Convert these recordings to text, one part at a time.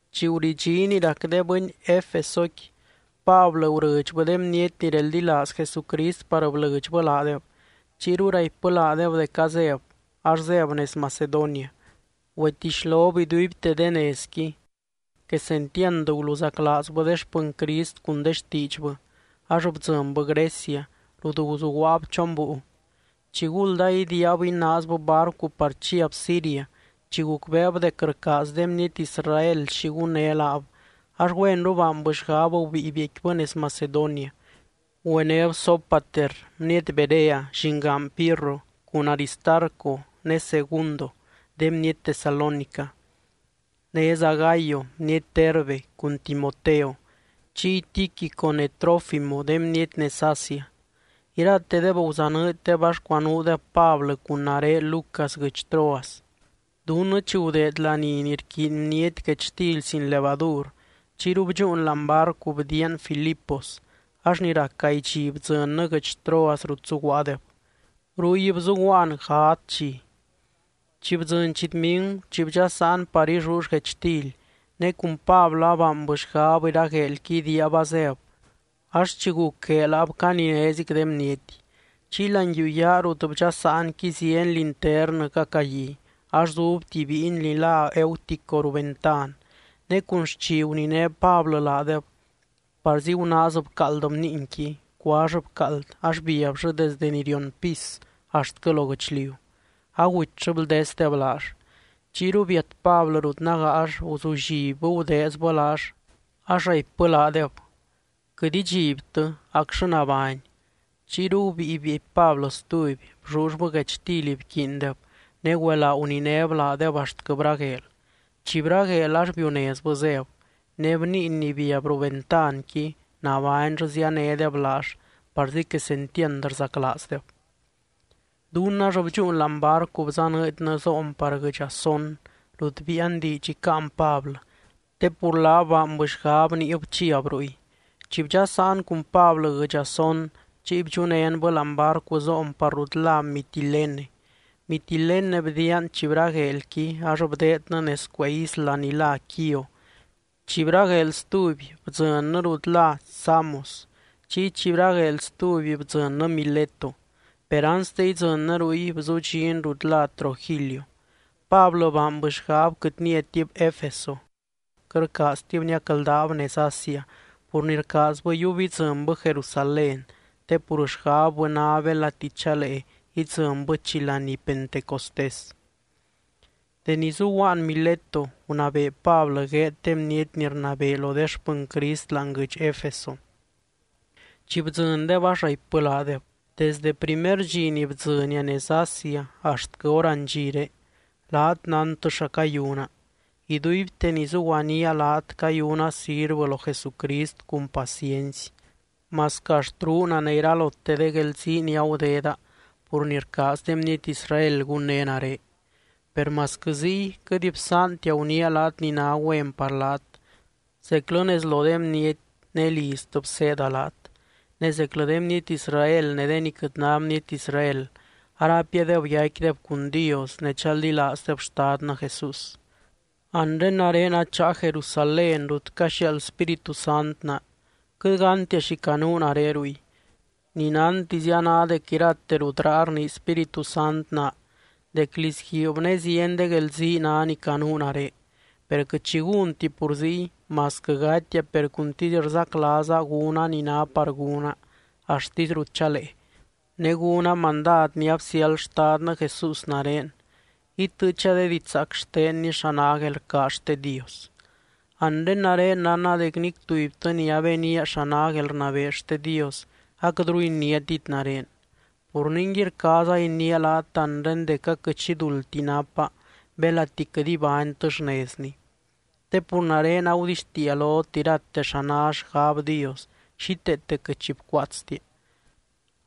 Chi guridxí ni rac de bɨny Efesoqui, Pablɨ gurɨdxbɨ de bniety ni reldilaaz Jesucrist par blɨdxbɨ laadeb. Chiyru raipbɨ laadeb dec azéb, ax zéb nez Macedonia. Güetixlob iduibte de nezqui, quesentiand guluzaclaazbɨ de xpɨny Crist cun de xtiidxbɨ, ax bdzɨnbɨ Grecia rut guzuguaab chon búiu. Chiguld aidiiab inaazbɨ barcu par chiab Siria, chi gucbeeb dec rcaaz de bniety Israel xi gunné laab, ax güenru baanbɨ xgab gubíi biecquibɨ nez Macedonia. Güenéb Sópater bniety Berea, llingaan Pirro, cun Aristarco ne Segundo de bniety Tesalónica, néza Gayo bniety Derbe, cun Timoteo, chiy Tíquico ne Trófimo de bniety nez Asia. Iratedeb guzanɨɨddeb ax cuanuudeb Pablɨ cun nare Lucas guɨdx Troas. Dunnɨ chi gudeed laní ni rquiiny bniety guechtily sin levadur, chiyru bdxúun láani barcu bdiian Filipos, ax ni rac gaay dxi bdzɨnnɨ guɨdx Troas rut zuguaadeb. Ruy bzuguaan gadz dxi. Chi bdzɨny chitmigu, chi bdxasaan par illull guechtily, ne cun Pablɨ abaanbɨ xgab iragueelqui idiiab azéb, ax chi guc gueel abcaninézic de bniety. Chiy láani yuu yaa rut bdxasaanqui zieny linternɨ cacagui, ax zub tuby bíiny ni lá Eutico ruu ventan. Ne cun xchi guniné Pablɨ laadeb, parzi gunaaz bcaald bniinqui, cuall bcaald ax biabllɨ desde ni rion pis axtquɨ lo guɨchliu, agutyllɨ bldesdeb laall. Chiyru biat Pablɨ rut nágaall, guzullibbɨ gudeezbɨ laall, ax raipbɨ laadeb: —Quɨt idxibtɨ, acllɨ nabány. Chiyru gubíi bieepy Pablɨ stuby, bllullbɨ guechtily bquiindeb, ne güelaa guninéb laadeb axtquɨ bragueel. Chi bragueel ax biunezbɨ zéb. Ne bniiny ni biab ruu ventanqui, nabányllɨ zíanedeb laall, parzi quesentiand rzaclaazdeb. Dunnɨ ax bdxúun láani barcu bzanɨɨdnɨ zoon par guɨdx Asón, rut biian diidx icáan Pablɨ, te pur laab baanbɨ xgab niib chiab ruy. Chi bdxasaan cun Pablɨ guɨdx Asón, chiy bdxunénbɨ láani barcu zoon par rut lá Mitilene. Mitilene bdiian, chi bragueelqui ax bdeednɨ nez cuee isla ni lá Quío. Chi bragueel stuby, bdzɨnnɨ rut lá Samos. Chiy chi bragueel stuby, bdzɨnnɨ Mileto, per anste idzɨnnɨ ruy, bzudxin rut lá Trogilio. Pablɨ baanbɨ xgab quɨt niatib Efeso, quɨt rcaaztib niacldaab nez Asia pur ni rcaazbɨ yiub idzɨnbɨ Jerusalén, te pur xgabbɨ ná belati chalee idzɨnbɨ chi laní Pentecostés. Deni zuguaan Mileto, gunabee Pablɨ gueed de bniety ni rnabee lo de xpɨny Crist láani guɨdx Efeso. Chi bdzɨndeb, ax raipbɨ laadeb: —Desde primer dxi ni bdzɨnia nez Asia axtquɨ hor andxiré, laat nántɨ xa cayuna. Iduibte ni zuguaníaa laat cayuna sirvɨ lo Jesucrist cun paciency, masquɨ axt ruuna ne iralote de guelzii ni agudeda pur ni rcaaz de bniety Israel gunné nare. Per masquɨ ziy quɨt bsaantia guniia laat ni ná güen par laat, zeclɨ nez lo de bniety ne liztɨ bseeda laat. Ne zeclɨ de bniety Israel ne de ni quɨt ná bniety Israel, araipiadeb yaicquideb cun Dios ne chaldilaazdeb Xtadnɨ Jesús. Anre nare acháa Jerusalén rut caxiaald Spíritu Sant naa, quɨt gántia xi canuu nare ruy. Ni nántizia ná dec irate rut raa rnii Spíritu Sant naa dec lizguiib ne zieny de guelzii ná ni canuu nare. Per quɨt xi gúnti pur ziy, masquɨ gatia per cuntisy rzaclaaza gúna ni ná par gúna axtisy rut chalee, ne gúna mandad ni absiáld Xtadnɨ Jesús nare, itɨɨcha de didxzaac xtenny xa ná guelrcaaz xte Dios. ’Anre nare nánna dec nic tubytɨ ni abenía xa ná guelrnabee xte Dios, aquɨtru iniátit nare. Pur ningui, rcaaza iniia laat anre dec aquɨt xi duldti napa belati quɨt ibánytɨ xnezni. Te pur nare agudixtiia lot irate xa ná xgab Dios, xíteete quɨt xi bcuaatstia.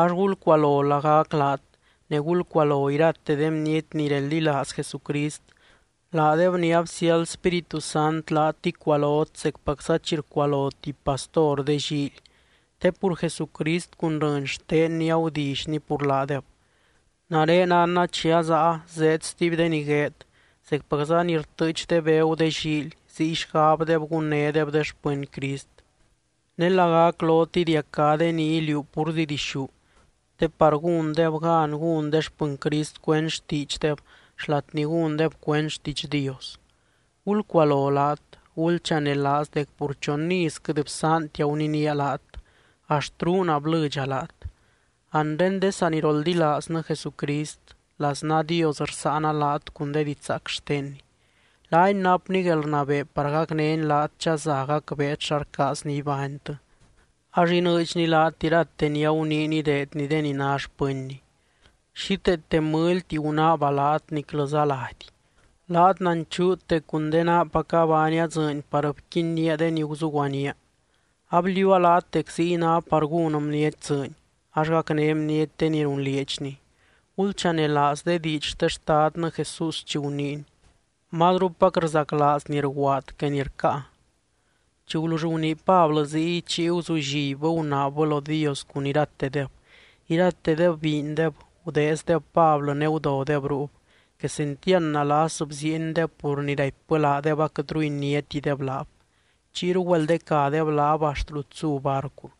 Ax gulcualo lagac laat ne gulcualo irate de bniety ni reldilaaz Jesucrist, laadeb ni absiáld Spíritu Sant laat icualot zecpacza chi rcualo tuby pastor de llíily, te pur Jesucrist cun rɨny xtenny agudillyny pur laadeb. Nare nánna chi azáa zeed stuby de ni gueed, zecpacza ni rtɨɨch de begu de llíily, ziy xgabdeb gunnédeb de xpɨny Crist. Ne lagac lot idiacá de ni iliuu púrzi dixú, te par gúndeb gan gún de xpɨny Crist cuend xtiidxdeb xlat ni gúndeb cuend xtiidx Dios. Gulcualo laat. Gulchanelaaz dec pur chon iz quɨt bsaantia guninía laat, axt ruuna blɨdxa laat. ’Anre de saniroldilaaznɨ Jesucrist, laznaa Dios rsáana laat cun de didxzaac xtenny. Laany napny guelrnabee par gacnény laat chaza gacbeet xa rcaazny ibánytɨ, ax inɨɨdxny laat irate ni aguniiny ideedny de ni ná xpɨnny. Xíteete mɨlyti gunaaba laat, niclɨza lady. Laat nanchuut dec cun de naapaca baania dzɨɨny par bquinnía de ni guzuguanía. Abliuua laat dec ziy ná par gún bniety dzɨɨny, ax gacné bniety de ni runlieedxni. Gulchanelaaz de diidx xte Xtadnɨ Jesús chi guniiny: “Mazrupac rzaclaaz ni rguaad que ni rcáa.” Chi gulull gunii Pablɨ ziy, chiy guzullibbɨ gunaabbɨ lo Dios cun iratedeb. Iratedeb biindeb, gudeezdeb Pablɨ ne gudodeb ruub. Quesentiand nalas bziiendeb, pur ni raipbɨ laadeb aquɨtru iniátideb laab. Chiyru güeldecadeb laab axt rut zu barcu.